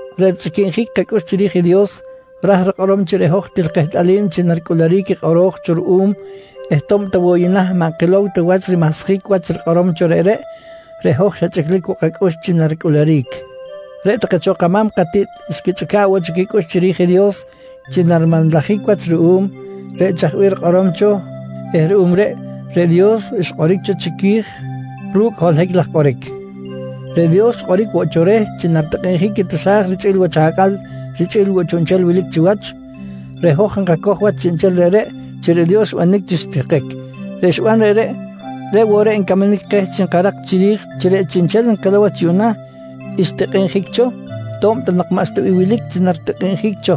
Reꞌ richꞌiquinjic kacꞌux chiri̱j i Dios, ra̱j rikꞌorom chi reꞌ hoj til kehtꞌalim chi naricꞌuluric i kꞌoro̱j cho ruꞌum eh to̱b ta woꞌ yuꞌna maꞌ nkilow ta wach i rimahsjic wach i rikꞌorom cho reꞌreꞌ, reꞌ hoj xa chꞌiclic woꞌ kacꞌux chi naricꞌuluric. Reꞌ take cho kama̱m katiꞌt xquichꞌica̱ꞌ woꞌ cho quicꞌux chiri̱j i Dios chi narimanlajic wach ruꞌum reꞌ chaj bih rikꞌorom cho eh ruꞌum reꞌ, reꞌ Dios xkꞌoric cho chiqui̱j ru̱cꞌ holohic laj kꞌoric. Reꞌ Dios xkꞌoric woꞌ cho reh chi naritikꞌinjic i taxa̱j richꞌi̱l wach acꞌal richꞌi̱l woꞌ chiꞌnchel wilic chiwach. Reꞌ hoj nkacoj wach chiꞌnchel reꞌreꞌ chi reꞌ Dios xbanic chi xitihkic. Reꞌ xiban reꞌreꞌ, reꞌ woꞌ reꞌ ncamanic keh chi enkarak chiri̱j chi reꞌ chiꞌnchel nkilow wach yuꞌna, xtikꞌinjic cho to̱b ta nak maꞌxta bih wilic chi naritikꞌinjic cho.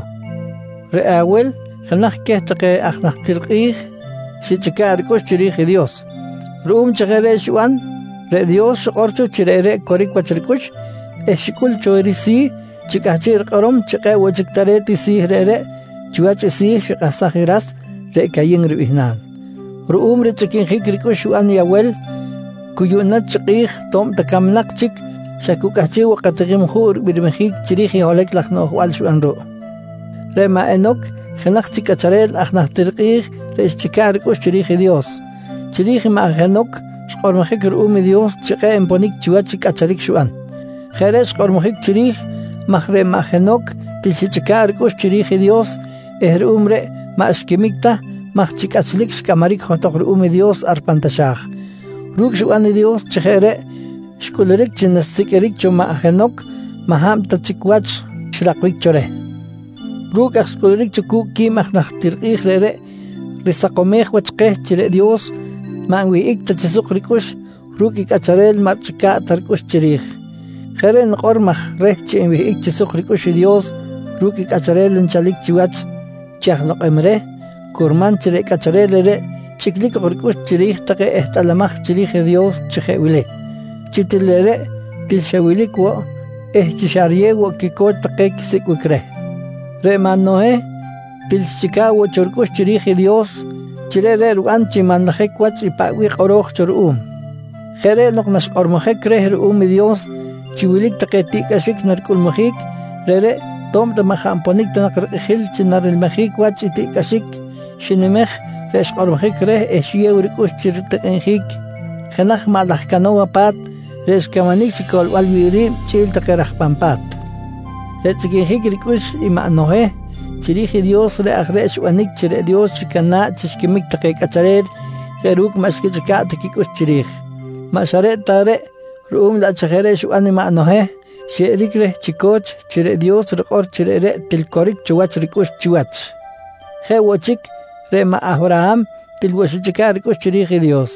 Reꞌ Awel jenaj queh take aj najtir kꞌi̱j xichꞌica̱ꞌ ricꞌux chiri̱j i Dios. Ruꞌum chi jeꞌ reꞌ xiban reꞌ Dios xikꞌor cho chi reꞌreꞌ coric wach ricꞌux eh xicꞌul cho i risi̱ chi cꞌahchiꞌ rikꞌorom chi kꞌe̱ꞌ woꞌ chic tare̱t i si̱ reꞌreꞌ chiwach i si̱ xikahsaj i ras, reꞌ Cayin ribihnal. Ruꞌum richꞌiquinjic ricꞌux xiban i Awel, cu yuꞌna chi kꞌi̱j to̱b ta camnak chic, xa cu cꞌahchiꞌ woꞌ katikim juꞌ ribirmijic chiri̱j i holohic laj rinoꞌjbal xiban ruꞌ. Reꞌ maꞌ Henoc jenaj chic cꞌacharel aj najtir kꞌi̱j reꞌ xichꞌica̱ꞌ ricꞌux chiri̱j i Dios. Chiri̱j maꞌ Henoc xkꞌormojic ruꞌum i Dios chi kꞌe̱ꞌ nponic chiwach i cꞌacharic xiban. Jeꞌ reꞌ xkꞌormojic chiri̱j maj reꞌ maꞌ Henoc til xichꞌica̱ꞌ ricꞌux chiri̱j i Dios eh ruꞌum reꞌ maꞌ xquimic ta maj chi cꞌachlic xcꞌamaric johtok ruꞌum i Dios ar pan taxa̱j. Ru̱cꞌ xiban i Dios chi jeꞌ reꞌ xcꞌuluric chi naxsiqꞌuiric cho maꞌ Henoc maꞌ hab ta chic wach xrakbic cho reh. Ru̱cꞌ aj xcꞌuluric cu̱cꞌ quib aj najtir kꞌi̱j reꞌreꞌ risakomej wach keh chi reꞌ Dios maꞌ nwihꞌic ta chi suk ricꞌux ru̱cꞌ i cꞌacharel maꞌ richꞌica̱ꞌ ta ricꞌux chiri̱j. Jeꞌ reꞌ nikꞌor maj reh chi enwihꞌic chi suk ricꞌux i Dios ru̱cꞌ i cꞌacharel nchalic chiwach chi aj lokꞌem reh, curman chi reꞌ cꞌacharel reꞌreꞌ chꞌiclic ok ricꞌux chiri̱j take ehtꞌalamaj chiri̱j i Dios chi jeꞌ wili: Chi til reꞌreꞌ til xa wilic woꞌ eh chi xa riyew woꞌ quico̱ch take quisicꞌbic reh. Reꞌ maꞌ Noheh til xichꞌica̱ꞌ woꞌ cho ricꞌux chiri̱j i Dios chi reꞌreꞌ riban chi nmanlajic wach i paꞌ bih kꞌoro̱j cho ruꞌum. Jeꞌ reꞌ nok naxkꞌormojic reh ruꞌum i Dios chi wilic take tiꞌcꞌaxic naricꞌulmujic, reꞌreꞌ to̱b ta maꞌ jaꞌ nponic ta nak rikꞌijil chi narilmijic wach i tiꞌcꞌaxic xinimej reꞌ xkꞌormojic reh eh xiyew ricꞌux chi ritikꞌinjic jenaj maꞌ laj cano̱wa pa̱t reꞌ xcamanic chi coꞌlbal wi̱ꞌ ri̱b chꞌi̱l take raj pan pa̱t. Reꞌ richꞌiquinjic ricꞌux i maꞌ Noheh chiri̱j i Dios reꞌ aj reꞌ xbanic chi reꞌ Dios xicana̱ꞌ chi xiquimic take cꞌacharel jeꞌ ru̱cꞌ maꞌ xquichꞌica̱ꞌ ta quicꞌux chiri̱j. Maꞌ xa reꞌ ta reꞌ, ruꞌum laꞌ chi jeꞌ reꞌ xiban i maꞌ Noheh xyeꞌeric reh chi co̱ch chi reꞌ Dios rikꞌor chi reꞌreꞌ til coric cho wach ricꞌux chiwach. Jeꞌ woꞌ chic, reꞌ maꞌ Awraham til woꞌ xichꞌica̱ꞌ ricꞌux chiri̱j i Dios.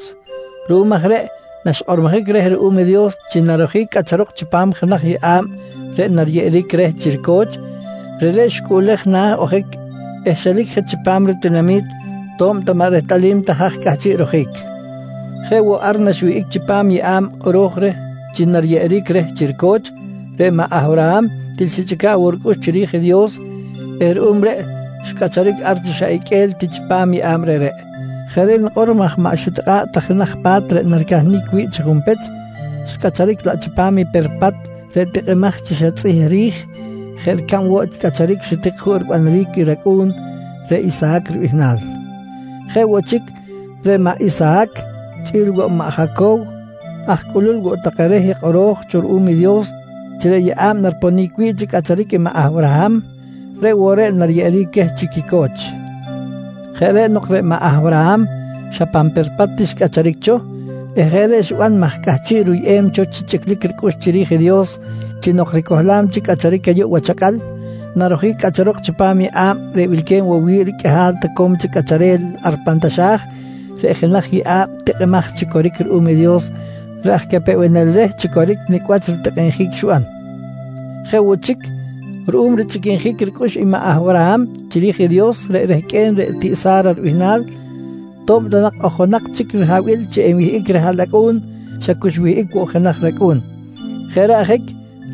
Ruꞌum aj reꞌ naxkꞌormojic reh ruꞌum i Dios chi narojic cꞌacharok chipam jenaj yeꞌa̱b reꞌ nariyeꞌeric reh chi rico̱ch, reꞌreꞌ xicꞌuꞌlej na̱ ojic eh xelic je chipam ritinami̱t to̱b ta maꞌ rehtꞌalim ta haj cꞌahchiꞌ rojic. Jeꞌ woꞌ ar naxwihꞌic chipam i yeꞌa̱b kꞌoro̱j reh chi nariyeꞌeric reh chi rico̱ch, reꞌ maꞌ Awraham til xichꞌica̱ꞌ woꞌ ricꞌux chiri̱j i Dios eh ruꞌum reꞌ xcꞌacharic ar chi xa iqꞌue̱l ti chipam yeꞌa̱b reꞌreꞌ. Jeꞌ reꞌ nikꞌor maj maꞌ xitikꞌa̱ꞌ ta jenaj pa̱t reꞌ naricahnic wi̱ꞌ chi junpech, xcꞌacharic laꞌ chipam i perpat reꞌ tikꞌimaj chi xa tzꞌih ri̱j jeꞌ ricab woꞌ cꞌacharic xitik juꞌ ribanaric i racꞌu̱n reꞌ Isahac ribihnal. Jeꞌ woꞌ chic, reꞌ maꞌ Isahac chꞌi̱l woꞌ i maꞌ Jacow, aj cꞌulul woꞌ take reh i kꞌoro̱j cho ruꞌum i Dios chi reꞌ yeꞌa̱b nariponic wi̱ꞌ chi cꞌacharic i maꞌ Awraham, reꞌ woꞌ reꞌ nariyeꞌeric queh chi quico̱ch. Jeꞌ reꞌ nok reꞌ maꞌ Awraham xa pan perpat ti xcꞌacharic cho eh jeꞌ reꞌ xiban maj cꞌahchiꞌ ruyꞌem cho chi chꞌiclic ricꞌux chiri̱j i Dios chi nok ricohlam chic cꞌacharic ayuꞌ wach acꞌal, narojic cꞌacharok chipam i yeꞌa̱b reꞌ wilque̱b woꞌ wi̱ꞌ riqꞌuihal toco̱m chic cꞌacharel ar pan taxa̱j reꞌ jenaj yeꞌa̱b tikꞌimaj chi coric ruꞌum i Dios reꞌ aj capewenel reh chi coric nicꞌ wach ritikꞌinjic i xiban. Jeꞌ woꞌ chic, ruꞌum richꞌiquinjic ricꞌux i maꞌ Awraham chiri̱j i Dios reꞌ rehqꞌue̱n reꞌ tiꞌ Sa̱ra ribihnal, to̱b ta nak ojonak chic rihabil chi enwihꞌic rihaꞌlacꞌu̱n, xa cu xwihꞌic woꞌ jenaj racꞌu̱n. Jeꞌ reꞌ ajic,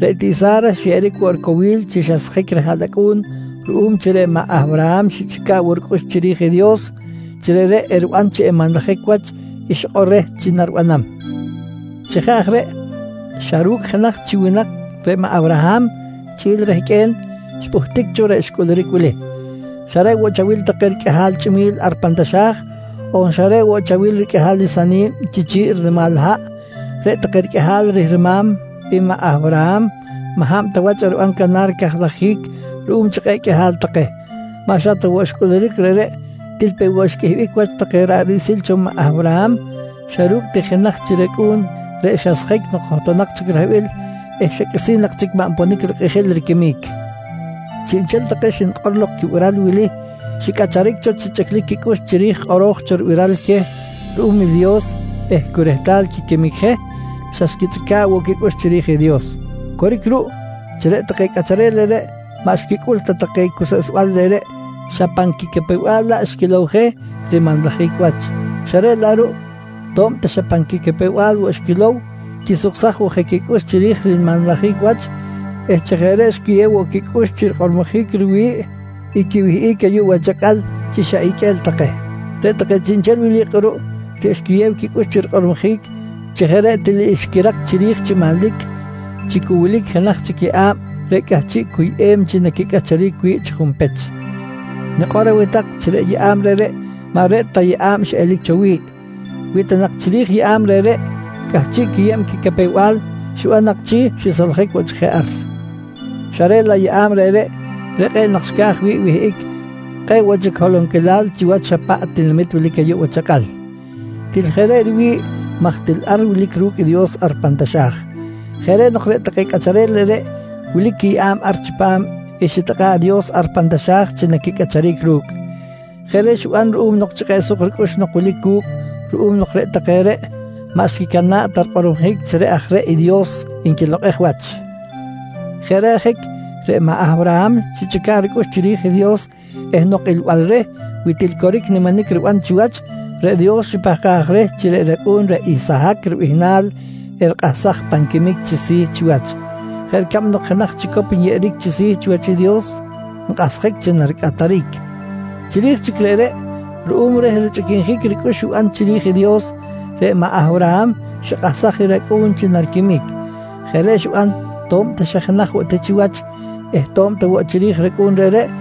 reꞌ tiꞌ Sa̱ra xyeꞌeric woꞌ ricowil chi xasjic rihaꞌlacꞌu̱n ruꞌum chi reꞌ maꞌ Awraham xichꞌica̱ꞌ woꞌ ricꞌux chiri̱j i Dios chi reꞌreꞌ eriban chi enmanlajic wach i xikꞌor reh chi naribanam. Chi jeꞌ aj reꞌ, xa ru̱cꞌ jenaj chi winak reꞌ maꞌ Awraham chꞌi̱l i rehqꞌue̱n, xpꞌuhtic cho reꞌ xcꞌuluric wili: Xa reꞌ woꞌ chawil take riqꞌuihal chꞌimi̱l ar pan taxa̱j on xa reꞌ woꞌ chawil riqꞌuihal i sani̱b chi chi̱ꞌ rinimal haꞌ, reꞌ take riqꞌuihal rihrima̱m i maꞌ Awraham maꞌ hab ta wach eriban canar cajlajic ruꞌum chi kꞌe̱ꞌ qꞌuihal take. Maꞌ xa ta woꞌ xcꞌuluric reꞌreꞌ, til peꞌ woꞌ xqꞌuihbic wach take ra̱ꞌ riꞌsil cho i maꞌ Awraham xa ru̱cꞌ ti i jenaj chi racꞌu̱n reꞌ xasjic nok johtonak chic rihabil eh xa qꞌuisi̱n nak chic maꞌ nponic rikꞌijil riquimic. Chiꞌnchel take xnikꞌor lok quibiral wili xicꞌacharic cho chi chꞌiclic quicꞌux chiri̱j kꞌoro̱j cho ribiral queh ruꞌum i Dios eh cu rehtal quiquimic je, xa xquichꞌica̱ꞌ woꞌ quicꞌux chiri̱j i Dios. Coric ruꞌ chi reꞌ take cꞌacharel reꞌreꞌ maꞌ xquicꞌul ta take cuseꞌsbal reꞌreꞌ xa pan quicapew-bal laꞌ xquilow je rimanlajic wach, xa reꞌ laꞌ ruꞌ to̱b ta xa pan quicapew-bal woꞌ xquilow, quisuksaj woꞌ je quicꞌux chiri̱j rimanlajic wach eh chi jeꞌ reꞌ xquiyew woꞌ quicꞌux chi rikꞌormojic riwi̱ꞌ i quiwihꞌic ayuꞌ wach acꞌal chi xa iqꞌue̱l take. Reꞌ take chiꞌnchel wili kꞌuruꞌ reꞌ xquiyew quicꞌux chi rikꞌormojic chi jeꞌ reꞌ til xquirak chiri̱j chi manlic chi cu wilic jenaj chic yeꞌa̱b reꞌ cꞌahchiꞌ cuyꞌem chi naquicꞌacharic wi̱ꞌ chi junpech. Nikꞌor aweh tak chi reꞌ yeꞌa̱b reꞌreꞌ maꞌ reꞌ ta yeꞌa̱b xiꞌelic cho wi̱ꞌ. Wi ta nak chiri̱j yeꞌa̱b reꞌreꞌ cꞌahchiꞌ quiyeb quicapew-bal, xiban nak chi xisoljic woꞌ chic je ar. Xa reꞌ laꞌ yeꞌa̱b reꞌreꞌ, reꞌ kꞌe̱ꞌ nak xca̱j wi̱ꞌ wihꞌic kꞌe̱ꞌ woꞌ chic holonquilal chiwach xa paꞌ tinamit wilic ayuꞌ wach acꞌal. Til jeꞌ reꞌ riwi̱ꞌ maj til ar wilic ru̱cꞌ i Dios ar pan taxa̱j. Jeꞌ reꞌ nok reꞌ take cꞌacharel reꞌreꞌ wilic quiyeꞌa̱b ar chipam i xitikꞌa̱ꞌ i Dios ar pan taxa̱j chi naquicꞌacharic ru̱cꞌ. Jeꞌ reꞌ xiban ruꞌum chi kꞌe̱ꞌ suk ricꞌux nok wilic cu̱cꞌ ruꞌum nok reꞌ take reꞌ maꞌ xquicana̱ꞌ ta rikꞌormojic chi reꞌ aj reꞌ i Dios nquilokꞌej wach. Jeꞌ reꞌ ajic reꞌ maꞌ Awraham xichꞌica̱ꞌ ricꞌux chiri̱j i Dios eh nok ilbal reh wi til coric niminic riban chiwach, reꞌ Dios xipahkaj reh chi reꞌ racꞌu̱n reꞌ Isahac ribihnal erikꞌahsaj pan quimic chi si̱ chiwach, jeꞌ ricab nok jenaj chicop nyeꞌeric chi si̱ chiwach i Dios nkꞌahsjic chi naricꞌataric. Chiri̱j chic reꞌreꞌ, ruꞌum reh richꞌiquinjic ricꞌux xiban chiri̱j i Dios, reꞌ maꞌ Awraham xikꞌahsaj i racꞌu̱n chi nariquimic. Jeꞌ reꞌ xiban to̱b ta xa jenaj woꞌ ti chiwach eh to̱b ta woꞌ chiri̱j racꞌu̱n reꞌreꞌ,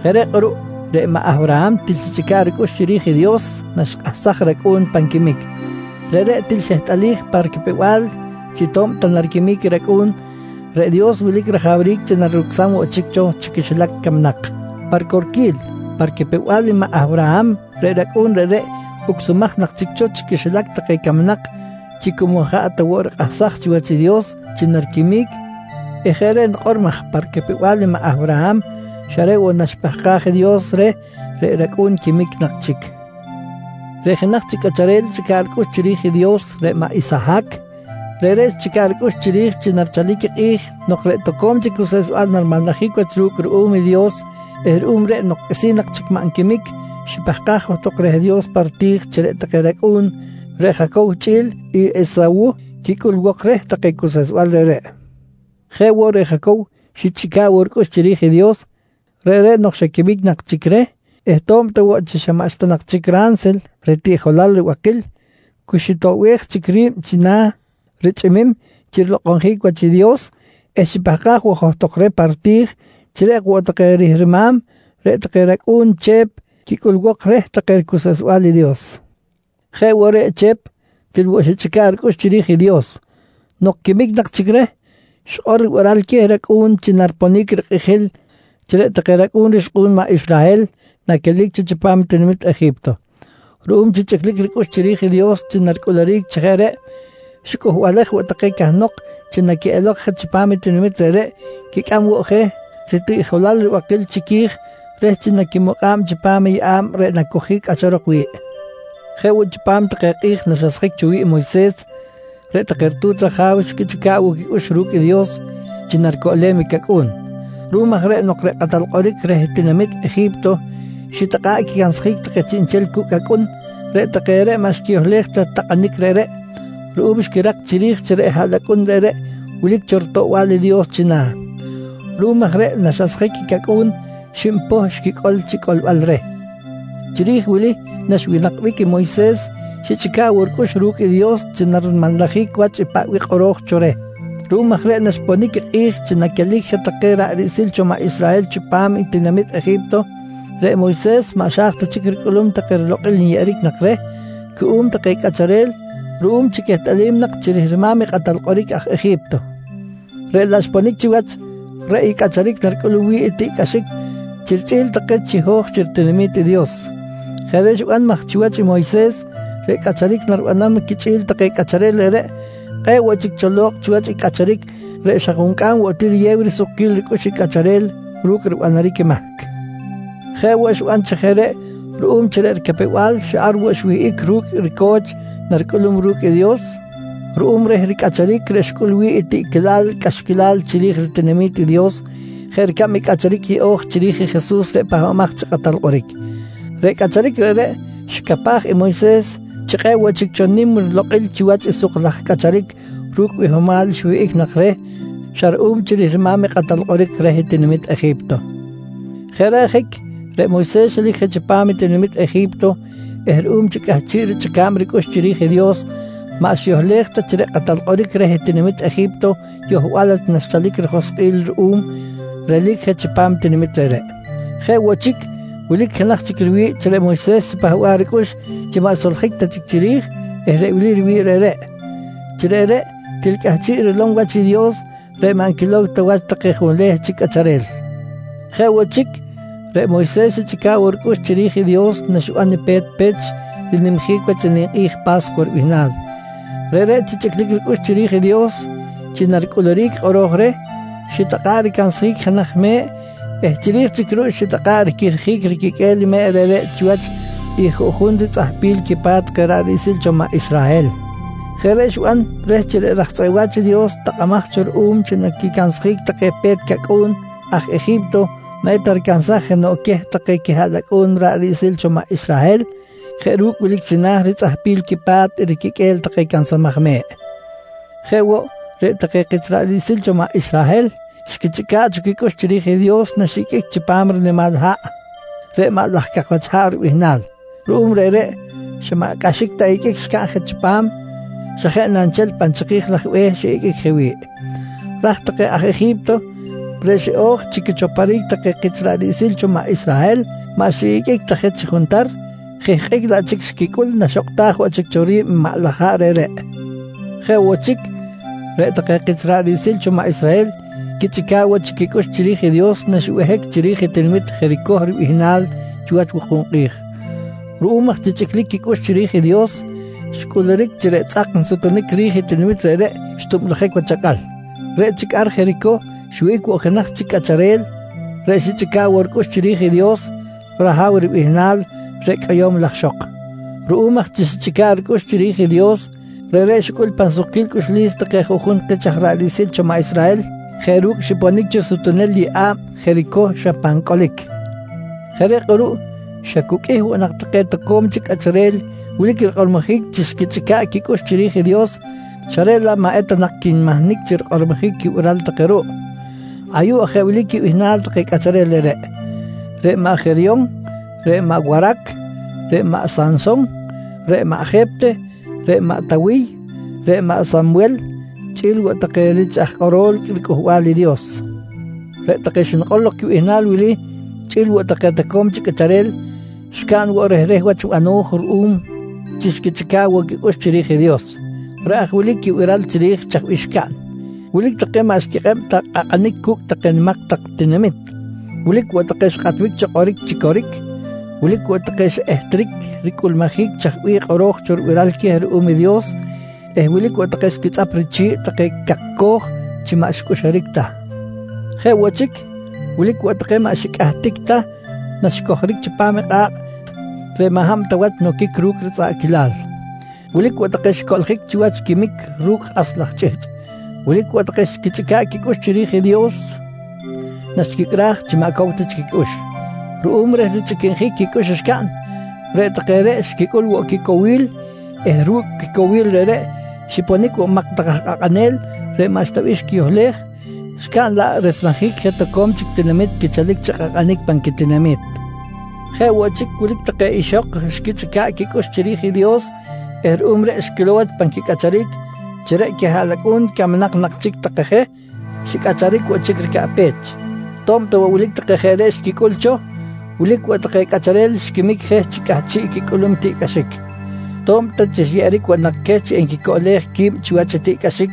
Jeꞌ reꞌ kꞌuruꞌ reꞌ maꞌ Awraham til xichꞌica̱ꞌ ricꞌux chiri̱j i Dios naxikꞌahsaj racꞌu̱n pan quimic. Reꞌreꞌ til xehtꞌalij pa ricapew-bal chi to̱b ta nariquimic i racꞌu̱n, reꞌ Dios wilic rajawric chi narucsam woꞌ chic cho chi quixilac camnak. Pa ricorquil, pa ricapew-bal i maꞌ Awraham reꞌ racꞌu̱n reꞌreꞌ ucsumaj nak chic cho chi quixilac take camnak chi cu maꞌ jaꞌ ta woꞌ rikꞌahsaj chiwach i Dios chi nariquimic eh jeꞌ reꞌ nikꞌor maj pa ricapew-bal i maꞌ Awraham xa reꞌ woꞌ naxipahkaj i Dios reh reꞌ racꞌu̱n quimic nak chic. Reꞌ jenaj chic cꞌacharel xichꞌica̱ꞌ ricꞌux chiri̱j i Dios reꞌ i maꞌ Isahac. Reꞌreꞌ xichꞌica̱ꞌ ricꞌux chiri̱j chi narichalic i kꞌi̱j nok reꞌ toco̱m chic cuseꞌsbal narimanlajic wach ru̱cꞌ ruꞌum i Dios eh ruꞌum reꞌ nok qꞌuisi̱n nak chic maꞌ nquimic, xipahkaj johtok reh Dios pa riti̱j chi reꞌ take racꞌu̱n, reꞌ Jacow chꞌi̱l i Esawuh, quicꞌulbok reh take cuseꞌsbal reꞌreꞌ. Jeꞌ woꞌ reꞌ Jacow xichꞌica̱ꞌ woꞌ ricꞌux chiri̱j i Dios. Reꞌreꞌ nok xa quimic nak chic reh eh to̱b ta woꞌ chi xa maꞌxta nak chic ransil ritiꞌjolal ribakil, cu xitoꞌbej chic ri̱b china̱ richꞌimim chi rilokꞌonjic wach i Dios eh xipahkaj woꞌ johtok reh pa riti̱j chi reꞌ ok woꞌ take rihrima̱m reꞌ take racꞌu̱n Chep quicꞌulbok reh take ricuseꞌsbal i Dios. Jeꞌ woꞌ reꞌ i Chep til woꞌ xichꞌica̱ꞌ ricꞌux chiri̱j i Dios. Nok quimic nak chic reh, xikꞌor ribiral queh racꞌu̱n chi nariponic rikꞌijil chi reꞌ take racꞌu̱n rixkꞌu̱n maꞌ Israhel naquelic cho chipam tinamit Eji̱pto. Ruꞌum chi chꞌiclic ricꞌux chiri̱j i Dios chi naricꞌuluric chi jeꞌ reꞌ, xicꞌuhbalej woꞌ take cahnok chi naquiꞌelok je chipam i tinamit reꞌreꞌ quicꞌam woꞌ je ritiꞌjolal ribakil chiqui̱j reh chi naquimukꞌa̱b chipam i yeꞌa̱b reꞌ nacojic cꞌacharok wi̱ꞌ. Jeꞌ woꞌ, chipam take kꞌi̱j naxasjic cho i Moyses, reꞌ take ritu̱t raja̱w xquichꞌica̱ꞌ woꞌ quicꞌux ru̱cꞌ i Dios chi naricoꞌlem i cacꞌu̱n. Ruꞌum aj reꞌ nok reꞌ kꞌatal kꞌoric reh tinamit Eji̱pto xitakꞌa̱ꞌ quicansjic take chiꞌnchel cucꞌ acꞌun, reꞌ take reꞌ maꞌ xquiyohlej ta takꞌanic reꞌreꞌ, ruꞌum xquirak chiri̱j chi reꞌ haꞌlacꞌun reꞌreꞌ wilic cho ritoꞌbal i Dios china̱. Ruꞌum aj reꞌ naxasjic i cacꞌu̱n, xib poh xquicꞌol chi coꞌlbal reh. Chiri̱j i wili naxwinakbic i Moyses, xichꞌica̱ꞌ woꞌ ricꞌux ru̱cꞌ i Dios chi narimanlajic wach paꞌ bih kꞌoro̱j cho reh. Ruꞌum aj reꞌ naxponic i kꞌi̱j chi naquelic je take ra̱ꞌ riꞌsil cho maꞌ Israhel chipam i tinamit Eji̱pto, reꞌ Moyses maꞌ xa̱j ta chic ricꞌulum take rilokꞌil nyeꞌeric nak reh cuꞌum take cꞌacharel ruꞌum chi quehtꞌalim nak chi rihrima̱m i kꞌatal kꞌoric aj Eji̱pto. Reꞌ laꞌ xponic chiwach, reꞌ i cꞌacharic reꞌ naricꞌulum wi̱ꞌ i tiꞌcꞌaxic chi richꞌi̱l take chiho̱j chi ritinami̱t i Dios. Jeꞌ reꞌ xiban maj chiwach i Moyses reꞌ cꞌacharic naribanam quichꞌi̱l take cꞌacharel reꞌreꞌ, kꞌe̱ꞌ woꞌ chic cho lo̱kꞌ chiwach i cꞌacharic reꞌ xa juncꞌam woꞌ ti riyew risukquil ricꞌux i cꞌacharel ru̱cꞌ ribanaric i mahc. Jeꞌ woꞌ, xiban chi jeꞌ reꞌ ruꞌum chi reꞌ ricapew-bal xa ar woꞌ xwihꞌic ru̱cꞌ i rico̱ch naricꞌulum ru̱cꞌ i Dios ruꞌum reh ricꞌacharic reꞌ xicꞌul wi̱ꞌ i tiꞌquilal cꞌaxquilal chiri̱j ritinami̱t i Dios, jeꞌ ricab i cꞌacharic yeꞌo̱j chiri̱j i Jesus reꞌ Pahbamaj chi Kꞌatal Kꞌoric. Reꞌ cꞌacharic reꞌreꞌ xicapaj i Moyses chi kꞌe̱ꞌ woꞌ chic cho nim rilokꞌil chiwach i suk laj cꞌacharic ru̱cꞌ bihomal xwihꞌic nak reh xa ruꞌum chi rihrima̱m i kꞌatal kꞌoric reh tinamit Eji̱pto. Jeꞌ reꞌ ajic reꞌ Moyses xelic je chipam i tinamit Eji̱pto eh ruꞌum chi cꞌahchiꞌ richꞌica̱b ricꞌux chiri̱j i Dios maꞌ xiyohlej ta chi reꞌ kꞌatal kꞌoric reh tinamit Eji̱pto yohbal wach naxchalic rijoskꞌil ruꞌum relic je chipam ritinami̱t reꞌreꞌ. Jeꞌ woꞌ chic, wilic jenaj chic riwi̱ꞌ chi reꞌ Moyses xipahba̱ꞌ ricꞌux chi maꞌ xsoljic ta chic chiri̱j eh reꞌ wili riwi̱ꞌ reꞌreꞌ: Chi reꞌreꞌ til cꞌahchiꞌ rilom wach i Dios reꞌ maꞌ nquilow ta wach take junleh chic cꞌacharel. Jeꞌ woꞌ chic, reꞌ Moyses xichꞌica̱ꞌ woꞌ chic ricꞌux chiri̱j i Dios naxiban i pe̱t pech rinimjic wach i ninkꞌi̱j Pa̱scuwa ribihnal. Reꞌreꞌ chi chꞌiclic ricꞌux chiri̱j i Dios chi naricꞌuluric i kꞌoro̱j reh, xitakꞌa̱ꞌ ricansjic i jenaj me̱ꞌ eh chiri̱j chic ruꞌ xitakꞌa̱ꞌ riquihrjic riquiqꞌue̱l me̱ꞌ reꞌreꞌ chiwach i juꞌjun ritzꞌahpil quipa̱t take ra̱ꞌ riꞌsil cho maꞌ Israhel. Jeꞌ reꞌ xiban reh chi reꞌ raj tzꞌeꞌ wa̱ch i Dios takꞌamaj cho ruꞌum chi quicansjic take pe̱t cacꞌu̱n aj Eji̱pto maꞌ eta ricansaj jenoꞌ queh take quihaꞌlacꞌu̱n ra̱ꞌ riꞌsil cho maꞌ Israhel jeꞌ ru̱cꞌ wilic china̱ ritzꞌahpil quipa̱t i riquiqꞌue̱l take cansamaj me̱ꞌ. Jeꞌ woꞌ, reꞌ take kich ra̱ꞌ riꞌsil cho maꞌ Israhel xquichꞌica̱ꞌ cho quicꞌux chiri̱j i Dios naxiꞌiqꞌuic chipam rinimal haꞌ reꞌ “Maꞌ laj Cak Wach Haꞌ” ribihnal. Ruꞌum reꞌreꞌ, xa maꞌ cꞌaxic ta iqꞌuic xcaꞌn je chipam, xa jeꞌ na nchel pan chiki̱j laj be̱h xiꞌiqꞌuic je wi̱ꞌ. Raj take aj Eji̱pto reꞌ xiꞌo̱j chi quichoporic take kich ra̱ꞌ riꞌsil cho maꞌ Israhel, maꞌ xiꞌiqꞌuic ta je chi juntar, jihkꞌic laꞌ chic xquicꞌul naxokꞌtaj woꞌ chic cho ri̱b maꞌ laj haꞌ reꞌreꞌ. Jeꞌ woꞌ chic, reꞌ take kich ra̱ꞌ riꞌsil cho maꞌ Israhel quichꞌica̱ꞌ woꞌ chic quicꞌux chiri̱j i Dios naxibehic chiri̱j i tinamit Jericoh ribihnal chiwach wuku̱b kꞌi̱j. Ruꞌum aj chi chꞌiclic quicꞌux chiri̱j i Dios, xcꞌuluric chi reꞌ tzꞌak nsutunic ri̱j i tinamit reꞌreꞌ xtublujic wach acꞌal. Reꞌ chic ar Jericoh xwihꞌic woꞌ jenaj chic cꞌacharel reꞌ xichꞌica̱ꞌ woꞌ ricꞌux chiri̱j i Dios, Rahaw ribihnal reꞌ cꞌoyo̱m laj ixok. Ruꞌum aj chi xichꞌica̱ꞌ ricꞌux chiri̱j i Dios, reꞌreꞌ xicꞌul pan sukquil cꞌuxlis take aj juꞌjun kich ra̱ꞌ riꞌsil cho maꞌ Israhel jeꞌ ru̱cꞌ xiponic cho sutunel yeꞌa̱b Jericoh xa pan cꞌolic. Jeꞌ reꞌ kꞌuruꞌ xa cu qꞌuih woꞌ nak take toco̱m chic cꞌacharel wilic quikꞌormojic chi xquichꞌica̱ꞌ quicꞌux chiri̱j i Dios, xa reꞌ laꞌ maꞌ eta nak quinmahnic chi rikꞌormojic quibiral take ruꞌ. Ayuꞌ aj wilic quibihnal take cꞌacharel reꞌreꞌ: Reꞌ maꞌ Jeryon, reꞌ maꞌ Warac, reꞌ maꞌ Sanson, reꞌ maꞌ Jepteh, reꞌ maꞌ Tawiy, reꞌ maꞌ Samwel chꞌi̱l woꞌ take rich aj kꞌorol riCꞌuhbal i Dios. Reꞌ take xnikꞌor lok quibihnal wili chꞌi̱l woꞌ take toco̱m chic cꞌacharel, xcaꞌn woꞌ rehreh wach bano̱j ruꞌum chi xquichꞌica̱ꞌ woꞌ quicꞌux chiri̱j i Dios. Reꞌ aj wili quibiral chiri̱j chaj bih xcaꞌn: Wilic take maꞌ xquikꞌeb ta kꞌakꞌanic cu̱cꞌ take nimak tak tinamit. Wilic woꞌ take xikꞌatbic cho kꞌoric chi coric. Wilic woꞌ take xiꞌehtric ricꞌulmujic chaj bih kꞌoro̱j cho ribiral queh ruꞌum i Dios eh wilic woꞌ take xquitzꞌap richi̱ꞌ take cakcoj chi maꞌ xicꞌuxuric ta. Jeꞌ woꞌ chic, wilic woꞌ take maꞌ xicꞌahtic ta naxicojoric chipam i kꞌa̱kꞌ reꞌ maꞌ hab ta wach noquic ru̱cꞌ ritzꞌaꞌquilal. Wilic woꞌ take xicoꞌljic chiwach i quimic ru̱cꞌ kꞌas laj chꞌihchꞌ. Wilic woꞌ take xquichꞌica̱ꞌ quicꞌux chiri̱j i Dios naxquicꞌraj chi maꞌ cow ta chic quicꞌux. Ruꞌum reh richꞌiquinjic quicꞌux xcaꞌn, reꞌ take reꞌ xquicꞌul woꞌ quicowil eh ru̱cꞌ quicowil reꞌreꞌ, xiponic woꞌ nimak tak aj kꞌakꞌanel reꞌ maꞌxta bih xquiyohlej, xcaꞌn laꞌ resmejic je toco̱m chic tinamit quichalic chi kꞌakꞌanic pan quitinami̱t. Jeꞌ woꞌ chic, wilic take ixok xquichꞌica̱ꞌ quicꞌux chiri̱j i Dios eh ruꞌum reꞌ xquilow wach pan quicꞌacharic chi reꞌ take quihaꞌlacꞌu̱n camnak nak chic take je, xicꞌacharic woꞌ chic ricaꞌpech. To̱b ta woꞌ wilic take jeꞌ reꞌ xquicꞌul cho, wilic woꞌ take cꞌacharel xiquimic je chi cꞌahchiꞌ quicꞌulum tiꞌcꞌaxic. To̱b ta xyeꞌeric woꞌ nak queh chi enquicoꞌlej qui̱b chiwach i tiꞌcꞌaxic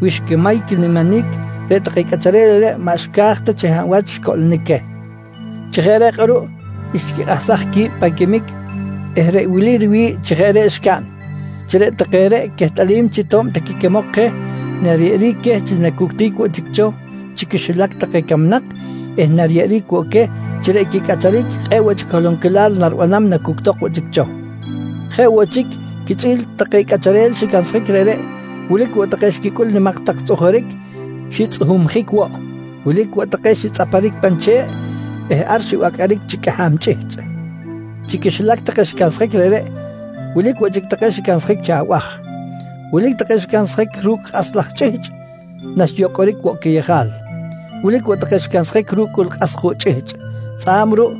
wi xquimay quiniminic, reꞌ take cꞌacharel reꞌreꞌ maꞌ xca̱j ta chi hab wach xcoꞌlonic queh. Chi jeꞌ reꞌ kꞌuruꞌ xquikꞌahsaj qui̱b pan quimic eh reꞌ wili riwi̱ꞌ chi jeꞌ reꞌ xcaꞌn: Chi reꞌ take reꞌ quehtꞌalim chi to̱b ta quiquimok je nariyeꞌeric queh chi nacuctic woꞌ chic cho chi quixilac take camnak eh nariyeꞌeric woꞌ queh chi reꞌ quicꞌacharic kꞌe̱ꞌ woꞌ chic holonquilal naribanam nacuctok woꞌ chic cho. Jeꞌ woꞌ chic quichꞌi̱l take cꞌacharel xicansjic reꞌreꞌ, wilic woꞌ take xquicꞌul nimak tak tzꞌujuric, xitzꞌuhumjic woꞌ. Wilic woꞌ take xitzꞌaparic pan che̱ꞌ eh ar xibacꞌaric chi cꞌaham chꞌihchꞌ. Chi quixilac take xicansjic reꞌreꞌ, wilic woꞌ chic take xicansjic chi abaj. Wilic take xicansjic ru̱cꞌ kꞌas laj chꞌihchꞌ naxyocꞌoric woꞌ quiyejal. Wilic woꞌ take xicansjic ru̱cꞌ cꞌul kꞌas juꞌ chꞌihchꞌ. Tzꞌa̱b ruꞌ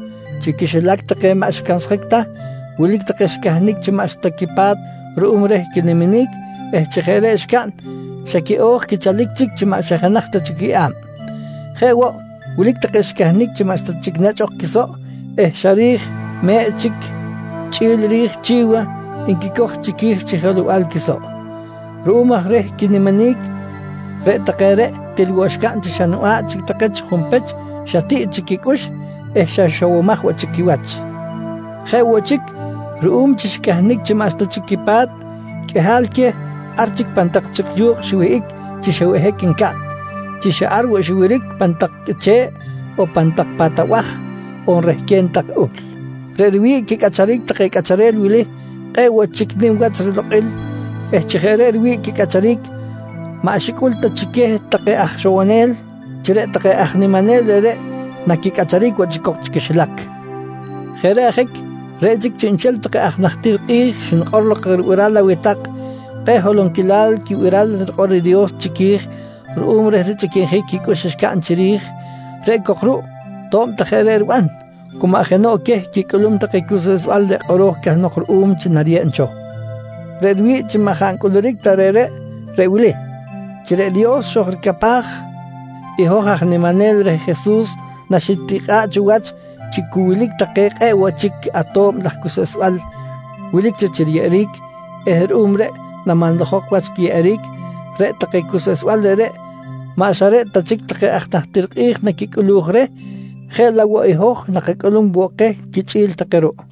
chi quixilac take maꞌ xicansjic ta, wilic take xicahnic chi maꞌxta quipa̱t ruꞌum reh quiniminic eh chi jeꞌ reꞌ xcaꞌn xa quiꞌo̱j quichalic chic chi maꞌ xa jenaj ta chic quiyeꞌa̱b. Jeꞌ woꞌ, wilic take xicahnic chi maꞌxta chic nechꞌ ok quisoꞌ eh xa ri̱j me̱ꞌ chic chꞌi̱l i ri̱j chi̱wa nquicoj chiqui̱j chi jelow-bal quisoꞌ. Ruꞌum aj reh quiniminic, reꞌ take reꞌ til woꞌ xcaꞌn chi xa niba̱ꞌ chic take chi junpech, xa tiꞌ chic quicꞌux eh xa ixowomaj woꞌ chic quiwach. Jeꞌ woꞌ chic ruꞌum chi xicahnic chi maꞌxta chic quipa̱t, qꞌuihal queh ar chic pan tak chik yu̱kꞌ xiwihꞌic chi xa behic ncaꞌn, chi xa ar woꞌ xiwiric pan tak qꞌuiche̱ꞌ on pan tak pa̱t abaj on rehquen tak uhl. Reꞌ riwi̱ꞌ quicꞌacharic take cꞌacharel wili kꞌe̱ꞌ woꞌ chic nim wach rilokꞌil eh chi jeꞌ reꞌ riwi̱ꞌ quicꞌacharic, maꞌ xicꞌul ta chi queh take aj ixowonel chi reꞌ take aj niminel reꞌreꞌ naquicꞌacharic woꞌ chic cok chi quixilac. Jeꞌ reꞌ ajic, reꞌ chic chiꞌnchel take aj najtir kꞌi̱j xnikꞌor lok ribiral aweh tak kꞌe̱ꞌ holonquil quibiral rikꞌor i Dios chiqui̱j ruꞌum reh richꞌiquinjic quicꞌux xcaꞌn chiri̱j. Reꞌ cok ruꞌ to̱b ta jeꞌ reꞌ riban, cu maꞌ jenoꞌ queh quicꞌulum take cuseꞌsbal reꞌ kꞌoro̱j cahnok ruꞌum chi nariyeb cho. Reꞌ riwi̱ꞌ chi maꞌ jaꞌ ncꞌuluric ta reꞌreꞌ, reꞌ wili: Chi reꞌ Dios xojricapaj i hoj aj niminel reh Jesus naxitikꞌa̱ꞌ cho wach chi cu wilic take kꞌe̱ꞌ woꞌ chic ato̱b laj cuseꞌsbal wilic cho chi riyeꞌeric eh ruꞌum reꞌ namanlajok wach quiyeꞌeric, reꞌ take cuseꞌsbal reꞌreꞌ maꞌ xa reꞌ ta chic take aj najtir kꞌi̱j naquicꞌuluj reh jeꞌ laꞌ woꞌ i hoj nakacꞌulum woꞌ keh quichꞌi̱l take ruꞌ.